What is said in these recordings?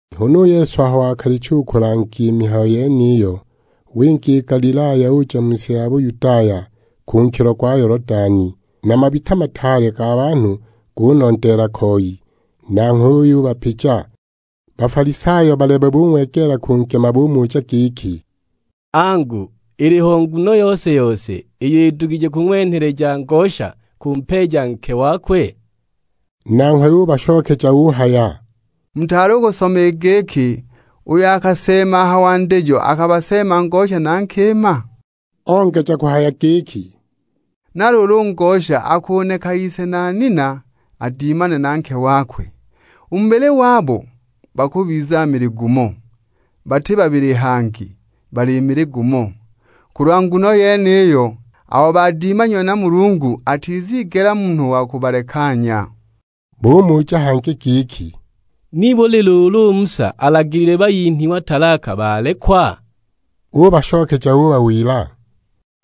Huna u Yesu aho wakalicha u kulanga i mihayo yeniyo, winga i Galilaya, uja mu si ya Buyudaya, ku nkilo gwa Yolodani. Na mabita mataale ga banhu gunondeela koi, nanghwe uyubapija. Bafalisayo balebe bung'wegeela kungema, bumuja giki; "Angu, iliho nguno yose-yose iyo idugije kung'wenheleja ngosha kumpeeja nke wakwe?" Nanghwe ubashokeja uhaya, "Mutaali u kusoma i giki uyo akaseema a ha wandijo akabaseema ngosha na nkima?" Ongeja kuhaya giki, "Na luulu u ngosha akuneka ise na nina adimane na nke wakwe. U mu bubili wabo bakubiza mili gumo. Bati babili hangi, bali mili gumo. Kulwa nguno yeniyo, abo badimanyiwe na Mulungu atizigela munhu wa kubalekanya." Bumuja hangi giki, "Nibuli luulu u Musa alagilile bayinhwa talaka balekwa?" Ubashokeja ubawila;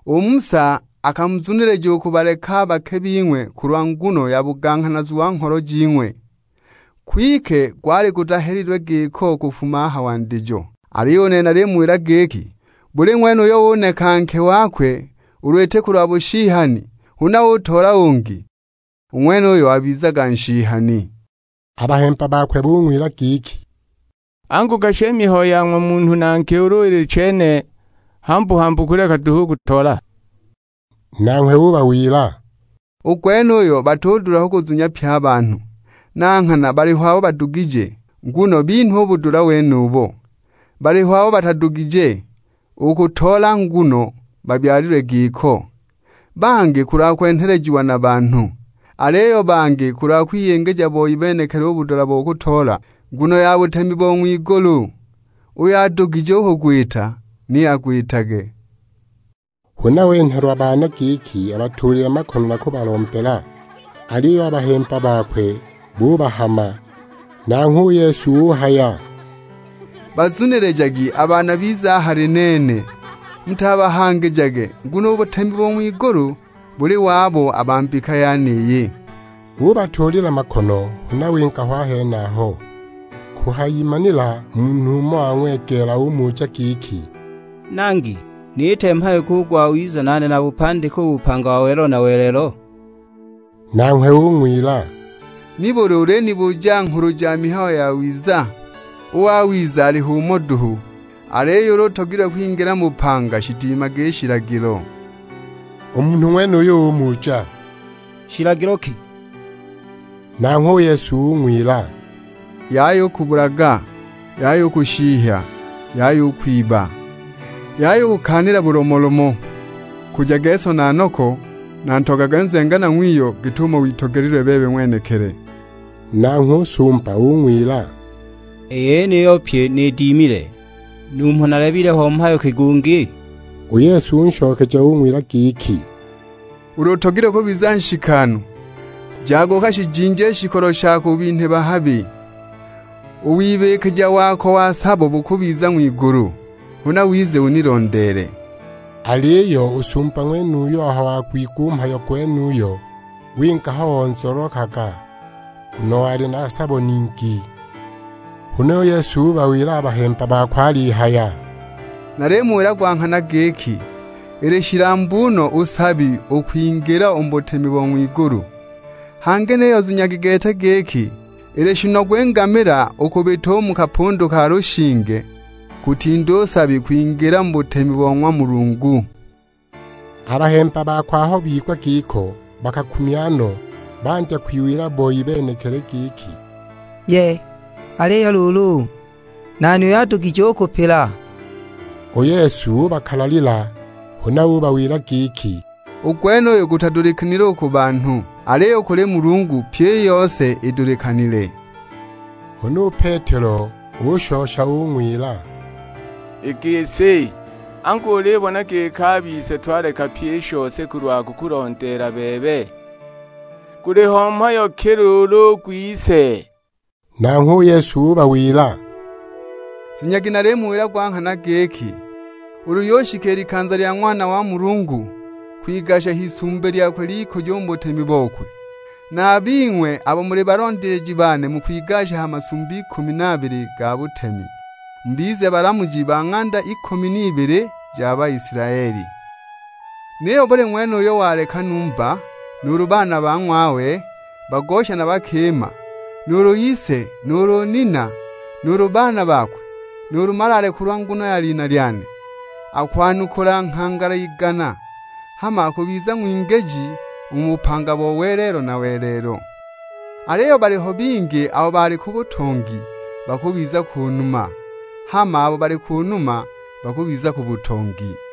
"U Musa akamuzunilija u kubaleka a bake bing'we kulwa nguno ya buganghanazu wa ngholo jing'we, kwike gwali gutahelilwe giko kufuma a ha wandijo. Aliyo u nene nalimuwila giki, buli ng'wene uyo uneka nke wakwe ulu iti kulwa bushihani, huna utoola ungi, u ng'wenuyo wabizaga nshihani." A bahemba bakwe bung'wila giki, "Angu gashi i mihayo ya ng'wa munhu na nke ulu ili chene, hambu-hambu kuleka duhu u kutoola!" Nanghwe ubawila; "U gwenuyo batudula kuguzunya pye a banhu; na nghana baliho abo bagudugije, nguno binhwa u budula wenubo. Baliho abo batadugije u kutoola nguno babyalilwe giko, bangi kulwa kwenhelejiwa na banhu, aliyo bangi kulwa kwiyingija boi benekili u budula bo kutoola, nguno ya butemi bo ng'wigulu. Uyo adugije u kugwita ni agwitage." Huna wenhelwa baana giki abatuulile makono na kubalombela, aliyo a bahemba bakwe bubahama. Nanghwe u Yesu uhaya; "Bazunilijagi a baana bize a hali nene. Mutabahangijage, nguno u butemi bo ng'wigulu buli wabo a ba mbika yeniyi." Ubatuulila makono, huna winga ho a henaho. Kuhayimanila, munhu umo wang'wegeela, umuja giki, "Nangi, niite mhayo ki u gwawiza nane nabupandike u bupanga bo welelo na welelo?" Nanghwe ung'wila; "Nibuli ulinibuja nghulu ja mihayo yawiza? U wawiza aliho umo duhu! Aliyo ulu utogilwe kwingila mu bupanga shidimage i shilagilo." U munhu ng'wenuyo umuja, "Shilagilo ki?" Nanghwe u Yesu ung'wila, "Yaya u kubulaga, Yaya u kushihya, Yaya u kwiba, Yaya u kukaanila bulomolomo. Nkujage so na noko, na Ntogagwe nzenganwa ng'wiyo, git'umo witogelilwe bebe ng'wenekili." Nanghwe u sumba ung'wila, "I yeniyo pyi nidimile, numho nalileba ho mhayo ki gungi?" U Yesu unshokeja ung'wila giki, "Ulu utogilwe kubiza nshikanu, jaga ukashijinje i shikolo shako ubinhe bahabi. U wibikija wako wa sabo bukubiza ng'wigulu, huna wize unilondeele." Aliyo u sumba ng'wenuyo aho wagwigwa u mhayo gwenuyo winga ho onzololokaga, nguno wali na sabo ningi. Huna u Yesu ubawila a bahemba bakwe alihaya; "Nalimuwila gwa nghana giki, ili shilambu no u nsabi u kwingila u mu butemi bo ng'wigulu. Hangi niyo zunyagi gete giki, ili shinogu i ngamila u kubita u mu kapundu ka lushinge, kutinda u nsabi kwingila mu butemi bo ng'wa Mulungu." A bahemba bakwe aho bigwa giko bakakumya no, bandya kwiwila boi benekili giki, "Yee! Aliyo luulu, nani uyo adugije u kupila?" U Yesu ubakalalila, huna ubawila giki, "U gwenuyu gutadulikanile u ku banhu. Aliyo u kuli Mulungu pyi i yose idulikanile." Huna u Petelo ushosha ung'wila; "I gisi, angu ulibona giki a bise twaleka pyi i shose kulwa kukulondeela bebe, guliho mhayo ki luulu u gwise?" Nanghwe u Yesu ubawila; "Zunyagi nalimuwila gwa nghana giki, ulu lyushika i likanza lya Ng'wana wa Munhu kwigasha h'isumbi lyakwe ly'ikujo u mu butemi bokwe, na a bing'we abo muli balondeeji bane mukwigasha ha masumbi ikumi na abili ga butemi, mubize balamuji ba ng'anda ikumi n'ibili ja Baisilaeli. Niyo buli ng'wene uyo waleka numba, nuulu baana ba ng'wawe bagosha na bakima, nuulu ise, nuulu nina, nuulu baana bakwe, nuulu malaale kulwa nguno ya lina lyane, akwanukula nghangala igana. Hama akubiza ng'wingiji u mu bupanga bo welelo na welelo. Aliyo baliho bingi abo bali ku butongi, bakubiza ku numa; hama abo bali ku numa bakubiza ku butongi."